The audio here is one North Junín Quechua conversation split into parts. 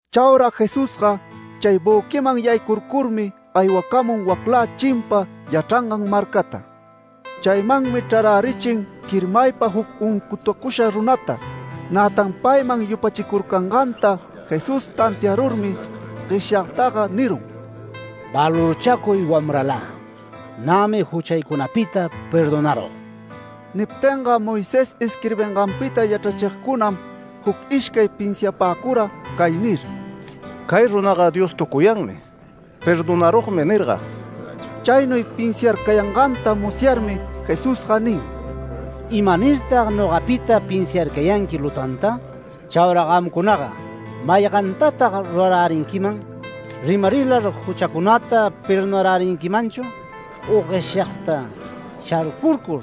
Chaura Jesusga chay büquiman yaycurcurmi aywacamun waclä chimpa yachrangan marcata. Chaymanmi chrarärichin quirmaypa juc uncutucusha runata. Nätan payman yupachicurcanganta Jesús tantiarurmi gueshyagtaga nirun: “Valorchacuy wamralä. Nämi juchaycunapita perdonarug”. Niptinga Moisés isquirbinganpita yachrachigcunam juc ishcay pinsiapäcura cay nir: “Cay runaga Dios tucuyanmi ‘Perdonarugmi’ nirga”. Chaynuy pinsiarcayanganta musyarmi Jesusga nin: “¿Imanirtag nogapita pinsiarcayanqui lutanta? Chaura gamcunaga ¿maygantatag rurarärinquiman? ¿‘¡Rimarilar juchacunata perdonarärinquimanchu!’ u gueshyagta ‘¡Sharcurcur!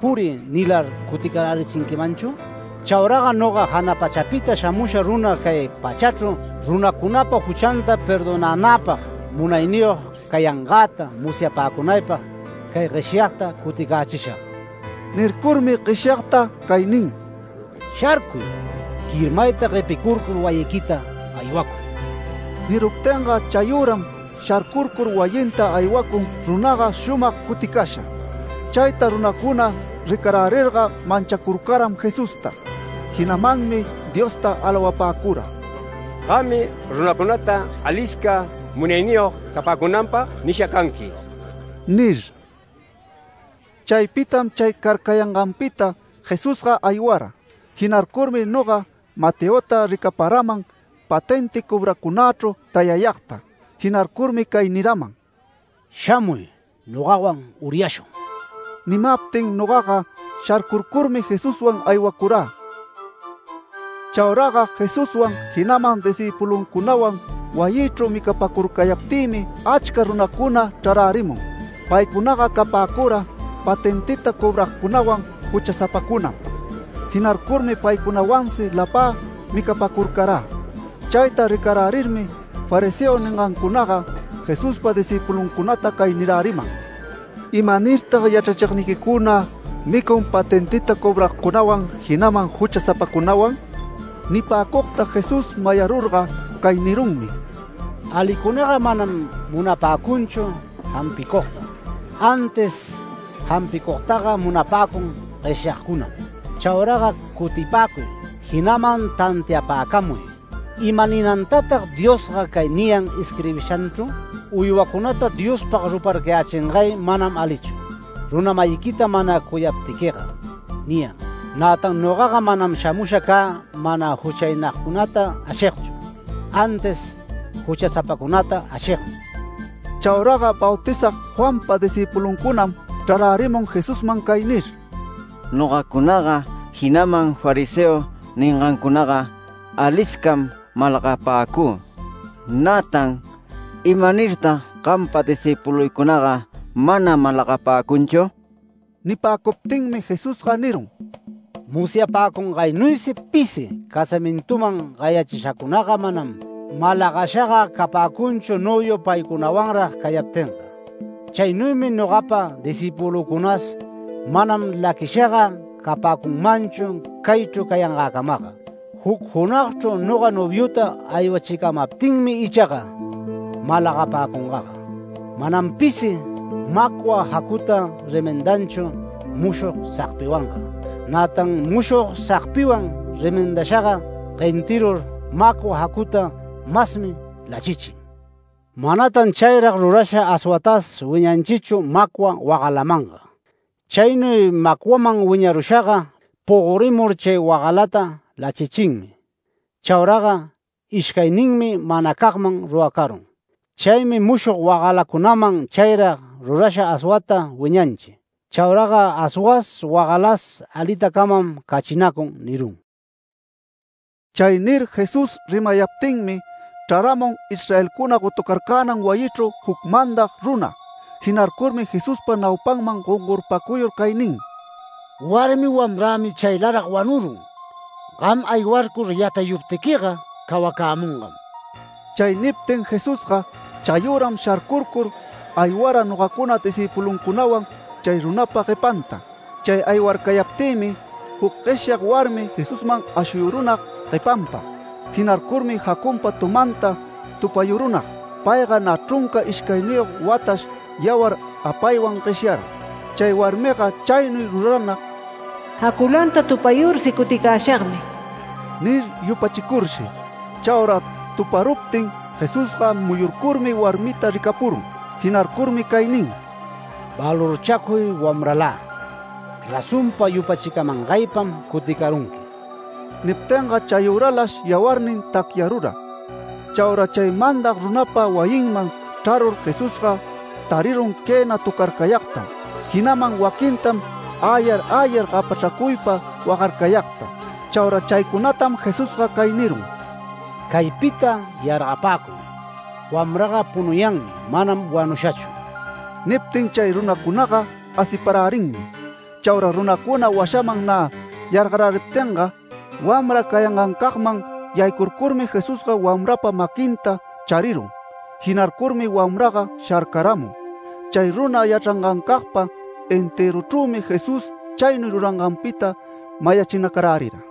¡Puriy!’ nilar cuticarärichinquimanchu? Chauraga noga jana pachapita shamusha runa cay pachachru runacunapa juchanta perdonänäpag munayniyog cayangäta musyapäcunaypag cay gueshyagta cuticächishag”. Nircurmi gueshyagta cay nin: “¡Sharcuy! ¡Quirmayta guepicurcur wayiquita aywacuy!” Niruptinga chayüram sharcurcur wayinta aywacun runaga shumag cuticasha. Chayta runacuna ricarärirga manchacurcaram Jesusta, jinamanmi Diosta alawapäcura “Gammi runacunata alisca munayniyog capäcunanpag nisha canqui” nir. Chaypitam chay carcayanganpita Jesusga aywayara. Jinarcurmi noga Mateota ricaparaman patenti cobracunächru tayayagta. Jinarcurmi cay niraman: “¡Shamuy, nogawan uryashun!” Nimaptin nogaga sharcurcurmi Jesuswan aywacurä. Chauraga Jesuswan jinaman discïpuluncunawan wayïchru micapäcurcayaptïmi achca runacuna chrarärimun. Paycunaga capäcura patentita cobragcunawan juchasapacunam. Jinarcurmi paycunawansi lapä micapäcurcarä. Chayta ricarärirmi, fariseo ningancunaga Jesuspa discïpuluncunata cay niräriman: “¿Imanirtag yachrachigniquicuna micun patentita cobragcunawan jinaman juchasapacunawan?” Nipäcugta Jesús mayarurga cay nirunmi: “Alicunaga manam munapäcunchu jampicugta, antis jampicugtaga munapäcun gueshyagcunam. Chauraga cutipäcuy jinaman tantiapäcamuy. ¿Imaninantatag Diosga cay niyan isquirbishanchru? ‘Uywacunata Diospag ruparcayächingay manam alichu, runa-mayiquita mana cuyapaptiquiga’ niyan. Nätan nogaga manam shamusha cä mana juchaynagcunata ashigchu, antis juchasapacunata ashigmi”. Chauraga Bautizag Juanpa discïpuluncunam chrarärimun Jesusman cay nir: “Nogacunaga jinaman fariseo ningancunaga aliscam malagapäcü. Nätan ¿imanirtag gampa discïpuluycunaga mana malagapäcunchu?” Nipäcuptinmi Jesusga nirun: “Musyapäcungaynuysi pisi casamintuman gayachishacunaga manam malagashaga capäcunchu noviu paycunawanrag cayaptinga. Chaynuymi nogapa discïpulücunas manam laquishaga capäcunmanchu caychru cayangäcamaga. Juc junagchru noga noviuta aywachicamaptinmi ichaga malagapäcungaga. Manam pisi macwa jacuta remendanchu mushog sagpiwanga. Nätan mushog sagpiwan remendashaga guentirur macwa jacuta masmi lachichin. Manatan chayrag rurasha aswatas wiñanchichu macwa wagalamanga. Chaynuy macwaman wiñarushaga pogorimur chay wagalata lachichinmi. Chauraga ishcayninmi manacagmanmi ruracarun. Chaymi mushog wagalacunaman chayrag rurasha aswata wiñanchi. Chauraga aswas wagalas alitacamam cachinacun” nirun. Chay nir Jesús rimayaptinmi chraramun Israelcuna gotucarcänan wayichru juc mandag runa. Jinarcurmi Jesuspa naupanman gongorpacuyur cay nin: “Warmi wamrämi chaylarag wanurun. Gam aywarcur yatayuptiquiga cawacämungam”. Chay niptin Jesusga chayüram sharcurcur aywara nogacuna discïpuluncunawan chay runapa guepanta. Chay aywarcayaptïmi juc gueshyag warmi Jesusman ashuyurunag guepanpa. Jinarcurmi jacunpa tumanta tupayurunag. Payga nä chrunca ishcayniyog watash yawar apaywan gueshyara. Chay warmiga chaynuy ruranag “Jaculanta tupayursi cuticäshagmi” nir yupachicurshi. Chaura tuparuptin Jesusga muyurcurmi warmita ricapurun. Jinarcurmi cay nin: “Valorchacuy wamralä. Razonpa yupachimangaypam cuticarunqui”. Niptinga chayüralash yawarnin tacyarura. Chaura chay mandag runapa wayinman chrarur Jesusga tarirun quëna töcarcayagtam, jinaman waquintam “Äyar, äyar” gapachracuypa wagarcayagta. Chaura chaycunatam Jesusga cay nirun: “Caypita yargapäcuy. Wamraga punuyanmi manam wanushachu”. Niptin chay runacunaga asiparärinmi. Chaura runacuna washaman nä yargaräriptinga, wamra cayangancagman yaycurcurmi Jesusga wamrapa maquinta charirun. Jinarcurmi wamraga sharcaramun. Chay runa yachrangancagpa entëruchrümi Jesús chaynuy ruranganpita mayachinacarärira.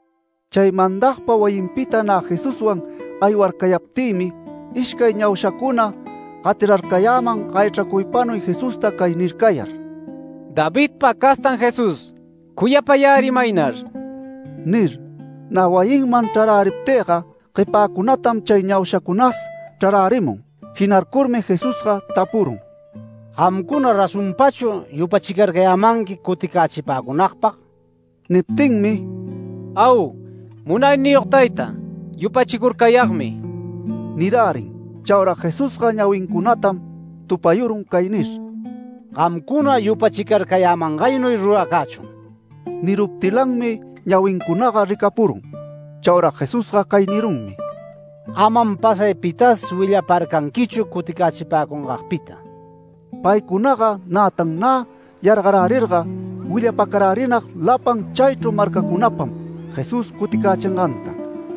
Chay mandagpa wayinpita nä Jesuswan aywarcayaptïmi, ishcay ñaushacuna gatirarcayäman gayachracuypanuy Jesusta cay nircayar: “¡Davidpa castan Jesús, cuyapayärimaynar!” nir. Nä wayiman chraräriptïga guepäcunatam chay ñaushacunas chrarärimun. Jinarcurmi Jesusga tapurun: “¿Gamcuna razonpachu yupachicarcayämanqui cuticächipäcunagpag?” Niptinmi “Au Munayniyog tayta, yupachicurcayagmi” nirärin. Chaura Jesusga ñawincunatam tupayurun cay nir: “Gamcuna yupachicarcayämangaynuy ruracächun”. Niruptilanmi ñawincunaga ricapurun. Chaura Jesusga cay nirunmi: “Amam pasay pitas willaparcanquichu cuticächipäcungagpita”. Paycunaga nätan nä yargarärirga willapacarärinag lapan chaychru marcacunapam Jesús cuticächinganta.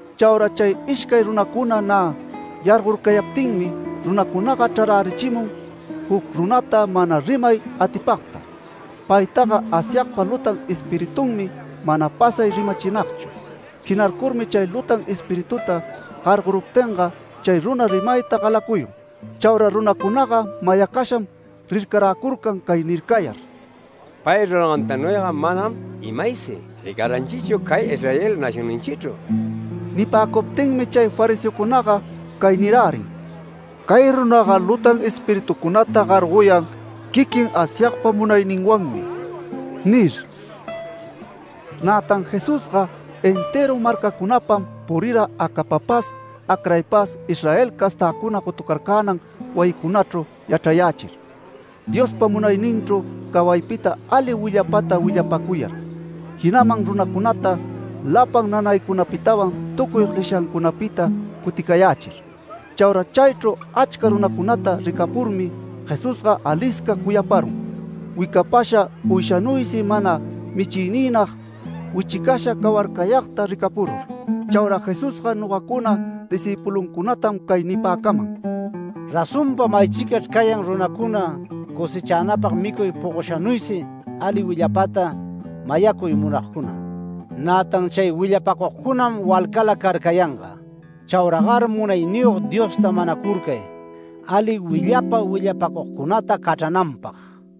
Chaura chay ishcay runacuna nä yargorcayaptinmi, runacunaga chrarärichimun juc runata mana rimay atipagta. Paytaga Asyagpa lutan espiritunmi mana pasay rimachinagchu. Jinarcurmi chay lutan espirituta gargoruptinga chay runa rimayta galacuyun. Chaura runacunaga mayacasham rircaräcurcan cay nircayar: “¡Pay rurangantanuyga manam imaysi ricaranchichu cay Israel nacionninchichru!” Nipäcuptinmi chay fariseocunaga cay nirärin: “Cay runaga lutan espiritucunata gargoyan quiquin Asyagpa munayninwanmi” nir. Nätan Jesusga entëru marcacunapam purira acapapas acraypas Israel castäcuna gotucarcänan wayicunachru yachrayächir, Diospa munayninchru cawaypita ali willapata willapacuyar, jinaman runacunata lapan nanaycunapitawan tucuy gueshyacunapita cuticayächir. Chaura chaychru achca runacunata ricapurmi Jesusga alisca cuyaparun, wicapasha uyshanuysi mana michigniynag wichicasha cawarcayagta ricapurur. Chaura Jesusga nogacuna discïpuluncunatam cay nipäcaman: “Razonpa maychicachr cayan runacuna cosëchanapag micuy pogoshanuysi ali willapata mayacuy munagcuna, nätan chay willapacugcunam walcala carcayanga. Chauragar Munayniyog Diosta manacurcay ali willapa willapacugcunata cachrananpag”.